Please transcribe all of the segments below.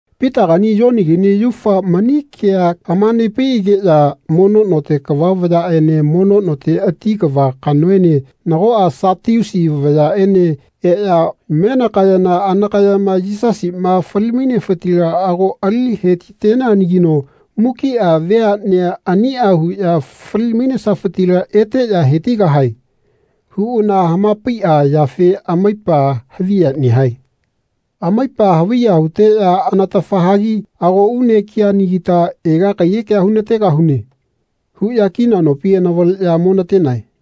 Pitagani Yonigani yaufa mani kea hama-nepaiꞌageꞌya mono note kava vayaꞌene mono note ati kava kanoene nagoꞌa Satiusi vayaꞌene eꞌya menakayana anakayama “Yisasiꞌma fali-mainefitila ago ali hetiteneanagino mukiꞌa veaꞌnea aniꞌa huꞌya fali-mainesafitila eteꞌya hetigahae.” huꞌana hamapaiꞌa yafe amaipa haviya nehae. Amaipa haviya huteꞌya anatafa hagi “Ago une kianagita ega kaiyekea hunategahune.” huꞌya kina nopi anavaleꞌya monatenae.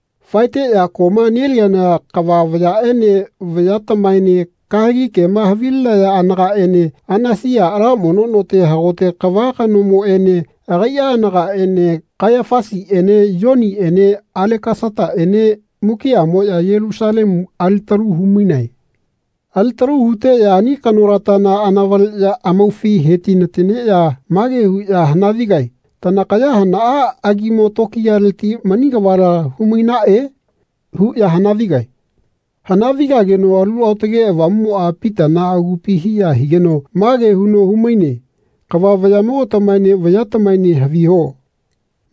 Faeteꞌya koꞌma neliana kava vayaꞌene vayatamaene kahegi kema havilinaya anagaꞌene Anasiꞌa ala mono note hagote kava kanomoꞌene agaiꞌa anagaꞌene Kaiyafasiꞌene Yoniꞌene Alekasataꞌene mukiꞌamoꞌya Yelusalemu alitalu humainae. Alitalu huteꞌya ani kanolatana anavaleꞌya amaufi hetinateneꞌya mage huꞌya hanavigae “Tanakaya hanaꞌa agimo tokiyaleti mani kavala humainaꞌe?” huꞌya hanavigae. Hana-vigageno Alu Aotage Avamuꞌmoꞌa Pitana agupina hiya higeno mage huno humaine Kava vayaꞌmogatamaene vayatamaene haviho.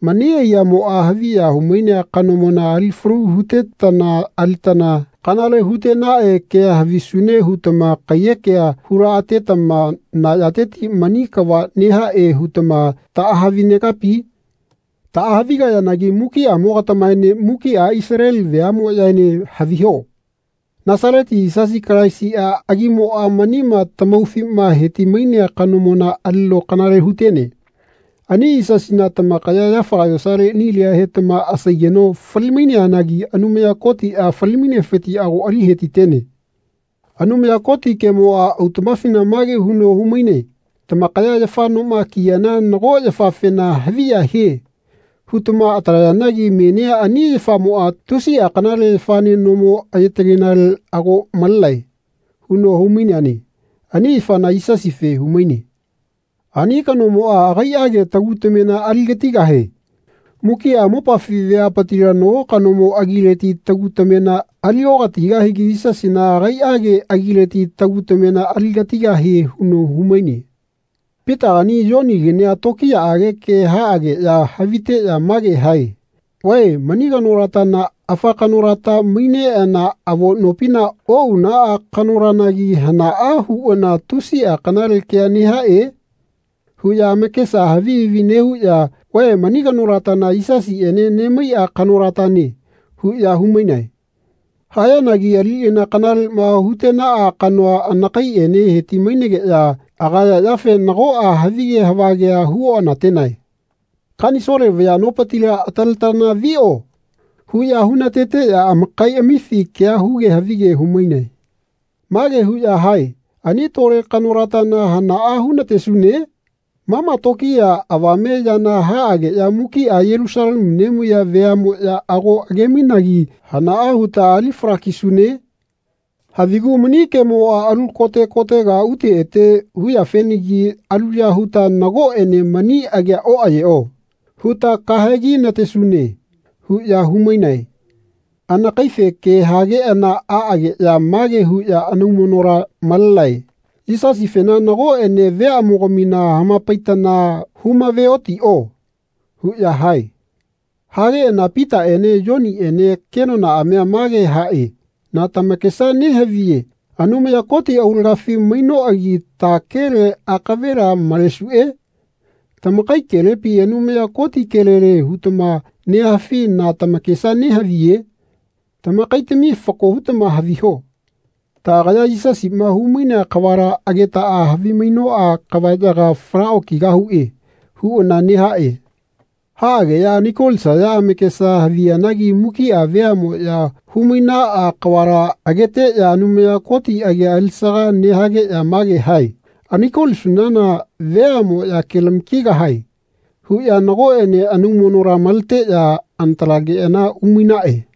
Mani aiyamoꞌa haviya humainea kanomona ali falu hutetana alitana kanale hutenaꞌe kea havisune hutama kaiyekea hulaꞌatetama na yateti mani kava nehaꞌe hutama taꞌahavi-negapi? Taꞌa-havigayanagi mukiꞌamogatamaene mukiꞌa Isaleli veaꞌmoꞌyaene haviho. Nasaleti Yisasi Kalaisi agimoꞌa manima tamaufima heti-mainea kanomona alino kanale hutene. Ani Yisasina tamakaya yafaga yosale nilia hetama asaigeno fali-maineanagi Anumaya Kotiꞌa fali-mainefiti ago ali hetitene. Anumaya Koti kemoꞌa autaꞌmafina mage huno humaine “Tamakaya yafa noma kiyana nago yafafena ‘Haviya hie.’ hutama atalayanagi menia ani yafamoꞌa tusiꞌa kanale yafane nomo ayetagenale ago malenae.” huno humaineane. Ani yafana Yisasife humaine. Ani kanomoꞌa agaiꞌage tagu tamena aligatigahie. Mukiꞌa mopafi veapitila nago kanomo agileti tagu tamena aliokatigahigi Yisasina agaiꞌage agileti tagu tamena aligatigahie huno humaine. Pitagani Yonigania tokiyaꞌage ke haꞌageꞌya haviteꞌya mage hae “Vae mani kanolatana afa kanolata maineꞌana avo nopina oꞌunaꞌa kanolanagi hanaꞌa huꞌana tusiꞌa kanale kea nehaꞌe?” huꞌya amakesa havi havi nehuꞌya “Vae mani kanolatana Yisasiꞌene nemaiꞌa kanolatane.” huꞌya humainae. Hayanagi aliꞌana kanaleꞌma hutenaꞌa kanoa anakaiꞌene heti-mainegeꞌya agaya yafe nagoꞌa havige havagea huoꞌanatenae. “Kanisole vaya nopitila ataletana viꞌo.” huꞌya hunateteꞌya amakaiꞌamifi kea huge havige humainae. Mage huꞌya hae “Ani tole kanolatana hanaꞌa hunatesune? Mama tokiya avame yana haꞌageꞌya mukiꞌa Yelusalemu nemaiya veaꞌmoꞌya ago age-mainagi hanaꞌa huta ali fala-kisune? Havigu mani kemoꞌa alu kote kotega ute ete huyafenagi aluya huta ‘Nagoꞌene mani agia oꞌayeꞌo.’ huta kahegi-natesune.” huꞌya humainae. Anakaife ke hageꞌana aꞌageꞌya mage huꞌya anaumonola malenae “Yisasifena nagoꞌene veaꞌmogamina hamapaitana humaveotiꞌo.” huꞌya hae. Hageꞌana Pitaꞌene Yoniꞌene kenonaꞌamia mage haꞌe “Na tamakesa nehaviye Anumaya Koti aulagafi mainoꞌagi ta kele akavela malesuꞌe? Tamakai kelepi Anumaya Koti kelele hutama nehafi na tamakesa nehaviye? Tamakaitami fako hutama haviho. Taꞌagaya Yisasiꞌma humainea kavala agetaꞌa havimainoꞌa kavaꞌyaga fala okigahuꞌe.” huꞌana nehaꞌe. Haꞌageꞌya anaikolisaya amakesa haviyanagi mukiꞌa veaꞌmoꞌya humainaꞌa kavala ageteꞌya Anumaya Koti agi alisaga nehageꞌya mage hae “Anaiko-lisunana veaꞌmoꞌya kelama-kigahae.” huꞌya nagoꞌene anaumonola maleteꞌya anatalageꞌana umainaꞌe.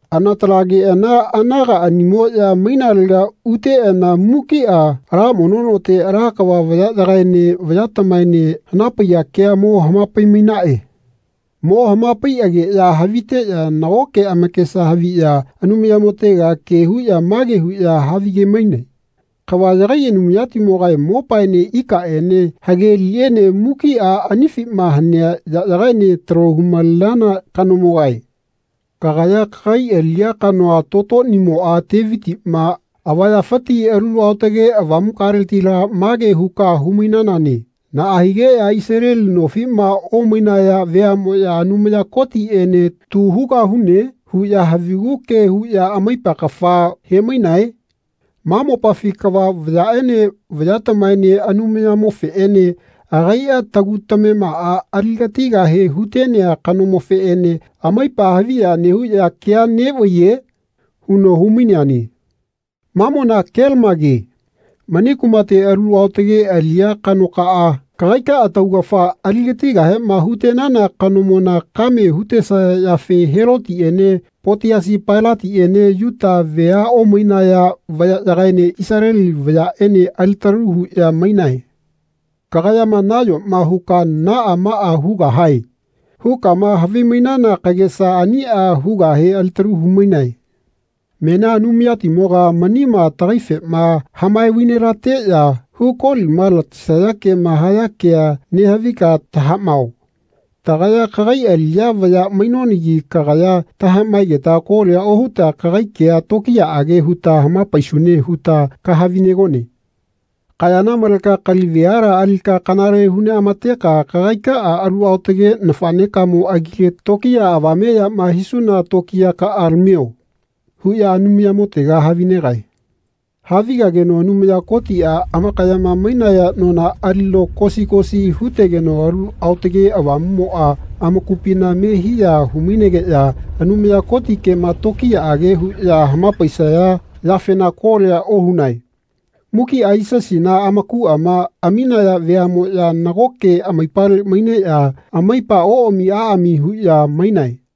Anatalageꞌana anagaꞌanimoꞌya mainalega uteꞌana mukiꞌa ala mono note ala kava vayaꞌyagaene vayatamaene hanapaiya kea mo hamapai-mainaꞌe. Mo hamapaiꞌageꞌya haviteꞌya nagoke amakesa haviꞌya Anumayamotega ke huꞌya mage huꞌya havige-mainae “Kava yagai Anumayatimogae mopaene ikaꞌene hage liꞌene mukiꞌa anifima hanea yaꞌyagaene talo humalenana kanomogae. Kagaya kagai aliꞌya kanoa, tototimoꞌa Tevitiꞌma avayafiti Alu Aotage Avamukaletila mage huka humainanane ‘Naꞌa higeꞌya Isaleli nofiꞌma omainaya veaꞌmoꞌya ‘Anumaya Kotiꞌene tu hugahune.’ huꞌya havigu ke huꞌya amaipa kafa hemainae? Ma mopafi kava vayaꞌene vayatamaene Anumayamofeꞌene agaiꞌa tagu tamemaꞌa aligatigahe hutenea kanomofeꞌene amaipa haviya nehuꞌya kea neꞌvaiye?’ huno humaineane. Mamona kelamage. Mani kumate alu aotage aliꞌya kanokaꞌa kagaikaꞌa taugafa aligatigahema hutenana kanomona kame hutesaya yafe Helotiꞌene Potiasi Pailatiꞌene Yuta vea omainaya vayaꞌyagaene Isaleli vayaꞌene alitalu huꞌya mainae. Kagayama nayoma huka ‘Naꞌa maꞌa hugahae.’ hukama havimainana kagesa aniꞌa hugahe alitalu humainae. Menia Anumayatimoga manima tagaifema hamae vainelateꞌya hu kolima latesaya kema haya kea nehavika tahaꞌmao. Tagaya kagai aliꞌya vaya mainonagi kagaya tahaꞌmaegeta kolia ohuta kagai kea tokiyaꞌage huta hamapaisune huta kahavinegone. Kayana maleka kali veala alika kanale huneꞌamateka kagaikaꞌa alu aotage nafaꞌnekamo agile tokiya avame yama hisuna tokiyakaꞌa lamio.” huꞌya Anumayamotega havinegae. Havigageno Anumaya Kotiꞌa amakayama mainaya nona alino kosi kosi hutegeno Alu Aotage Avamuꞌmoꞌa amakupina me hiya humainegeꞌya Anumaya Koti kema tokiyaꞌage huꞌya hamapaisaya yafena kolia ohunae. Mukiꞌa Yisasina amakuꞌama aminaya veaꞌmoꞌya nagoke amaipale maineꞌya amaipa oꞌami aꞌami huꞌya mainae.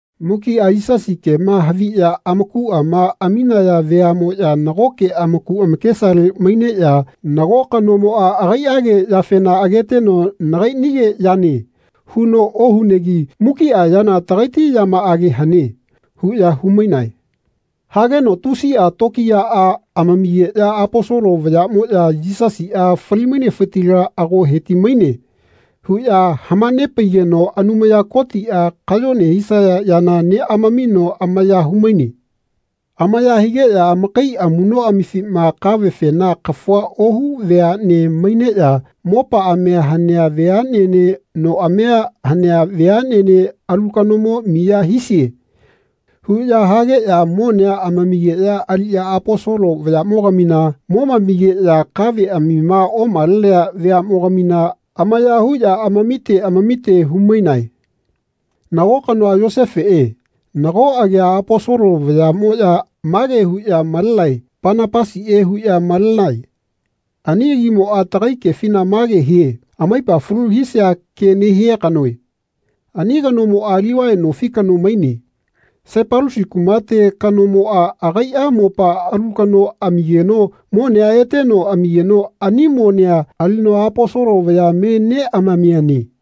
Mukiꞌa Yisasi kema haviꞌya amakuꞌama aminaya veaꞌmoꞌya nagoke amaku amakesale maineꞌya nago kanomoꞌa agaiꞌage yafena ageteno “Nagaiꞌnige yane.” huno ohunegi “Mukiꞌa yana tagaiti yamaꞌage hane.” huꞌya humainae. Hageno tusiꞌa tokiyaꞌa amamigeꞌya Aposolo vayaꞌmoꞌya “Yisasiꞌa fali-mainefitila ago heti-maine.” huꞌya hamanepaigeno Anumaya Kotiꞌa kayone hisaya yana neꞌamamino amaya humaine. Amaya higeꞌya amakai amuꞌnoꞌamifina kavefena kafua ohu veaꞌne maineꞌya mopaꞌamia hanea veaꞌnene noꞌamia hanea veaꞌnene “Alu kanomo miya hisie.” huꞌya hageꞌya monea amamigeꞌya aliꞌya Aposolo vayaꞌmogamina momamigeꞌya kaveꞌamima omalenea veaꞌmogamina amaya huꞌya amamite amamite humainae. Nago kanoa Yosefeꞌe, nago agia Aposolo vayaꞌmoꞌya mage huꞌya malenae Panapasiꞌe huꞌya malenae. Ani agimoꞌa tagai kefina mage hie “Amaipa falu hisia ke nehia kanoe.” Ani kanomoꞌa Livai nofi kano maine. Saipalusi kumateti kanomoꞌa agaiꞌa mopa alu kano amigeno monea eteno amigeno ani monea alino Aposolo vaya me neꞌamamiane.